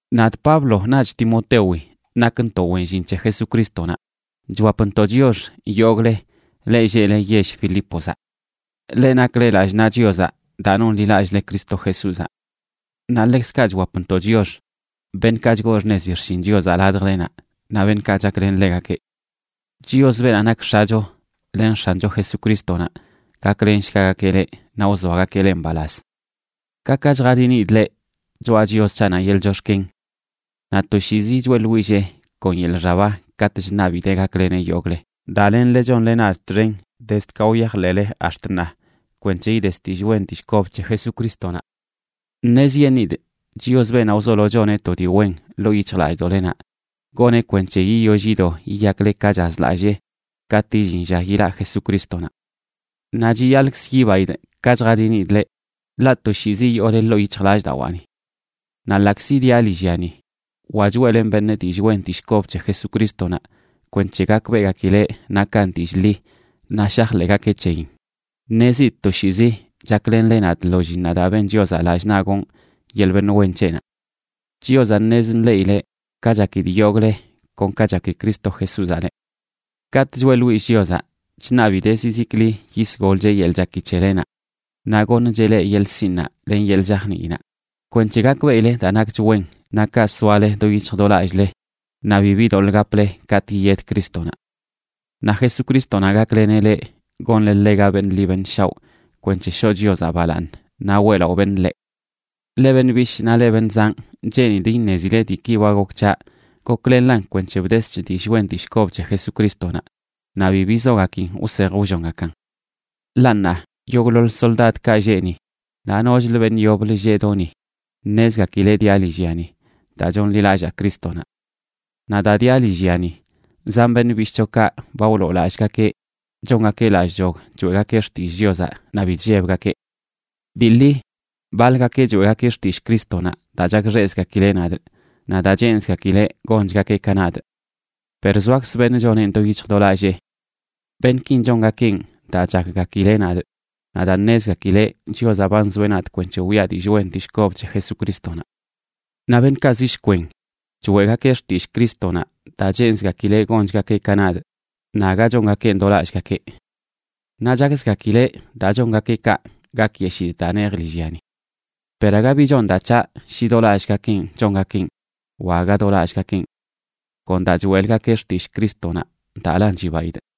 Nadꞌ Pablo naꞌch Timotewi nakntoꞌ wen llin c̱he Jesucrístonaꞌ, chwapntoꞌ chiox yogꞌle, leꞌ lleꞌle yell Filípozaꞌ, leꞌ nakle lallꞌ naꞌ Chiozaꞌ daa nonḻilallꞌle Cristo Jesúzaꞌ. Naꞌ ḻekzkaꞌ chwapntoꞌ chiox beṉꞌkaꞌ chgoo xṉezi xshin Chiozaꞌ ladjlenaꞌ naꞌ beṉꞌkaꞌ chaklen ḻegakeꞌ. Chios, beenaꞌ nak X̱acho len X̱ancho Jesucrístonaꞌ gaklenshgagakeꞌ leꞌ naꞌ wzoagakeꞌ leꞌ mbalaz. Ka ka chjadinidꞌ leꞌ choꞌa Chios c̱haꞌnaꞌ yeḻꞌ chox̱ken. Naꞌ toshiizi choeꞌḻwillee kon yeḻꞌ xaba katꞌ chṉabidee gakleneꞌ yogꞌle, daa lenle chonle nadꞌ txen, dezd ka wyajḻeꞌle ax̱t ṉaa, kwenc̱he ides dillꞌ wen dillꞌ kob c̱he Jesucrístonaꞌ. Ṉezyeṉꞌidꞌ Chios, beenaꞌ wzolo choneꞌ to dii wen ḻoo yic̱hjlallꞌdoꞌlenaꞌ, goneꞌ kwenc̱he yiyoll yido yiyakle ka chazlallee katꞌ illin lla yilaꞌ Jesucrístonaꞌ. Naꞌ chiyaḻꞌkz yibaidꞌ ka chjadinidꞌ leꞌ, ḻaꞌ toshiizi yoole ḻoo yic̱hjlallꞌdawaani. Naꞌ ḻaꞌkzi diaꞌ lillyani wa choeꞌlenꞌ beṉꞌ dillꞌ wen dillꞌ kob c̱he Jesucrístonaꞌ kwenc̱he gakbeꞌgakileꞌ nakan dillꞌ ḻi naꞌ shajḻeꞌgakeꞌ c̱heyin, ṉezidꞌ toshiizi chaklenle nadꞌ lo llinnaꞌ daa ben Chiozaꞌ lallꞌ naꞌ gonꞌ yeḻꞌ beṉꞌ wen c̱heꞌnaꞌ. Chiozaꞌ ṉez nḻeꞌileꞌ ka chakidꞌ yogꞌle kon ka chaki Cristo Jesúzaꞌ leꞌ. Katꞌ choeꞌḻwillꞌ Chiozaꞌ, chṉabidee zizikli yisgolcheꞌ yeḻꞌ chaki c̱helenaꞌ, naꞌ goṉcheꞌ leꞌ yeḻꞌ sinꞌnaꞌ len yeḻꞌ chajniinaꞌ kwenc̱he gakbeꞌile daa nakch wen naꞌ kaꞌ soale do yic̱hj do lallꞌle naꞌ bibi doḻꞌ gaple katꞌ yiyed Crístonaꞌ. Naꞌ Jesucrístonaꞌ gakleneꞌ leꞌ gonle ḻega beṉꞌ ḻi beṉꞌ shaoꞌ kwenc̱he shoꞌ Chiozaꞌ balaaṉ naꞌ weꞌlaꞌo beṉꞌ ḻeꞌ. Leꞌ beṉꞌ bishꞌ naꞌ leꞌ beṉꞌ zanꞌ, cheenidꞌ iṉezile diiki ba gok c̱haꞌ goklenlan kwenc̱he bdesch dillꞌ wen dillꞌ kob c̱he Jesucrístonaꞌ, naꞌ bi bizogakin wsej wllongakan. Ḻaꞌ ṉaa yogꞌḻoḻ soldadkaꞌ lleꞌ ni naꞌ nochlə beṉꞌ yoblə lleꞌ do ni ṉezgakileꞌ diaꞌ lillyani daa chonḻilallaa Crístonaꞌ. Naꞌ daa diaꞌ lillyani, zan beṉꞌ bishꞌchokaꞌ ba wloolallꞌgakeꞌ chongakeꞌ lallꞌchog choeꞌgakeꞌ xtillꞌ Chiozaꞌ naꞌ bi chllebgakeꞌ. Dii ḻi baḻgakeꞌ choeꞌgakeꞌ xtillꞌ Crístonaꞌ daa chakxeꞌzgakileꞌ nadꞌ naꞌ daa cheenzgakileꞌ gonchgakeꞌ ka nadꞌ. Per zoakz beṉꞌ choneꞌn do yic̱hj do lallee. Beṉꞌkin chongakeꞌn daa chakgakileꞌ nadꞌ naꞌ daa ṉezgakileꞌ Chiozaꞌ ba nzoeꞌ nadꞌ kwenc̱he wiꞌa dillꞌ wen dillꞌ kob c̱he Jesucrístonaꞌ. Naꞌ beṉꞌkaꞌ zi shkwen choeꞌgakeꞌ xtillꞌ Crístonaꞌ daa cheenzgakileꞌ gonchgakeꞌ ka nadꞌ, naꞌ aga chongakeꞌn do lallꞌgakeꞌ. Naꞌ chakzgakileꞌ daa chongakeꞌ kaꞌ gakyeshidꞌ daa nejꞌ lillyani. Per aga bi chon daa c̱haꞌ shi do lallꞌgakenꞌ chongakeꞌn wa aga do lallꞌgakenꞌ; kon daa choeꞌlgakeꞌ xtillꞌ Crístonaꞌ, daalan chibaidꞌ.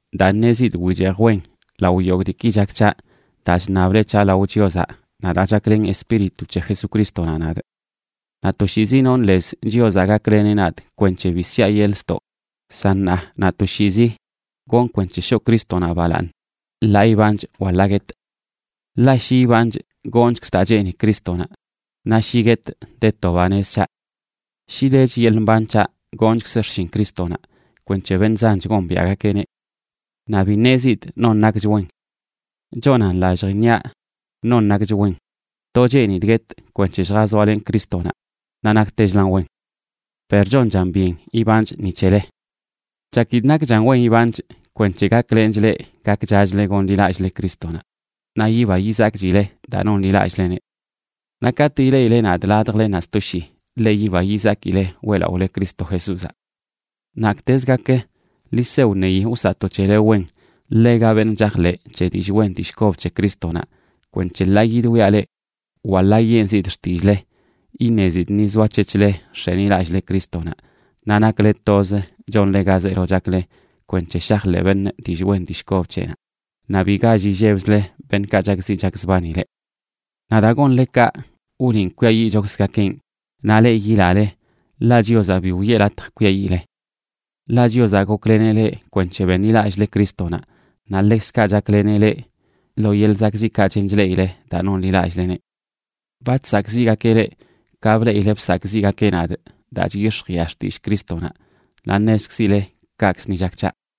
daa ṉezidꞌ wichejꞌ wen lao yogꞌ diiki chak c̱haꞌ daa chṉable c̱haꞌ lao Chiozaꞌ naꞌ daa chaklen Espíritu c̱he Jesucrístonaꞌ nadꞌ. Naꞌ toshiizi nonꞌ lez Chiozaꞌ gakleneꞌ nadꞌ kwenc̱he bi siaꞌ yeḻꞌ ztoꞌ, san ṉaa naꞌ toshiizi gonꞌ kwenc̱he shoꞌ Crístonaꞌ balaaṉ, ḻaa ibanchꞌ wa ḻaa guetꞌ. Ḻaꞌ shi ibanchꞌ, gonchkzꞌ daa cheeni Crístonaꞌ; naꞌ shi guetꞌ, de to banez c̱haꞌ. Shi dech yeḻꞌ mban c̱haꞌ, gonchkzꞌ xshin Crístonaꞌ kwenc̱he beṉꞌ zanch gombiaꞌgakeꞌneꞌ. Naꞌ bi ṉezidꞌ non nakch wen. Chonan lallj iṉiaꞌ non nakch wen: to cheenidꞌ guetꞌ kwenc̱he lljazoalenꞌ Crístonaꞌ, naꞌ naktechlan wen. Per chonchan byen ibanchꞌ ni c̱hele. Chakidꞌ nakchan wen ibanchꞌ kwenc̱he gaklenchꞌ leꞌ gakchachle gonḻilallꞌle Crístonaꞌ naꞌ yiba yizakchile daa nonḻilallꞌleneꞌ. Naꞌ katꞌ ileꞌile nadꞌ ladjlenaꞌ sto shii, ḻe yiba yizakile weꞌlaꞌole Cristo Jesúzaꞌ. Naktez gak, ḻi se wṉeyi wsaꞌto c̱hele wen ḻega beṉꞌ chajḻeꞌ c̱he dillꞌ wen dillꞌ kob c̱he Crístonaꞌ kwenc̱he ḻaa yidwiaꞌ leꞌ wa ḻaa yenzidꞌ xtillꞌle, iṉezidꞌ ni zoac̱hec̱hle nx̱enilallꞌle Crístonaꞌ naꞌ nakle toz chonle ga zeelo chakle kwenc̱he shajḻeꞌ beṉꞌ dillꞌ wen dillꞌ kob c̱heꞌnaꞌ, naꞌ bi gall illebzle beṉꞌkaꞌ chakziꞌ chakzbani leꞌ. Naꞌ daa gonle kaꞌ, wliꞌn kwiayiꞌchokzgakenꞌ, naꞌ leꞌ yilale, ḻaꞌ Chiozaꞌ bi wiꞌe latj kwiayiꞌle. Ḻaꞌ Chiozaꞌ gokleneꞌ leꞌ kwenc̱he beṉlilallꞌle Crístonaꞌ, naꞌ ḻekzkaꞌ chakleneꞌ leꞌ lo yeḻꞌ zakꞌziꞌkaꞌ chen chleꞌile daa nonḻilallꞌleneꞌ. Ba chsakꞌziꞌgakeꞌ leꞌ ka bleꞌile bsakꞌziꞌgakeꞌ nadꞌ daa chyix̱jiꞌa xtillꞌ Crístonaꞌ, naꞌ ṉezkzile kaꞌkzə ni chak c̱haꞌ.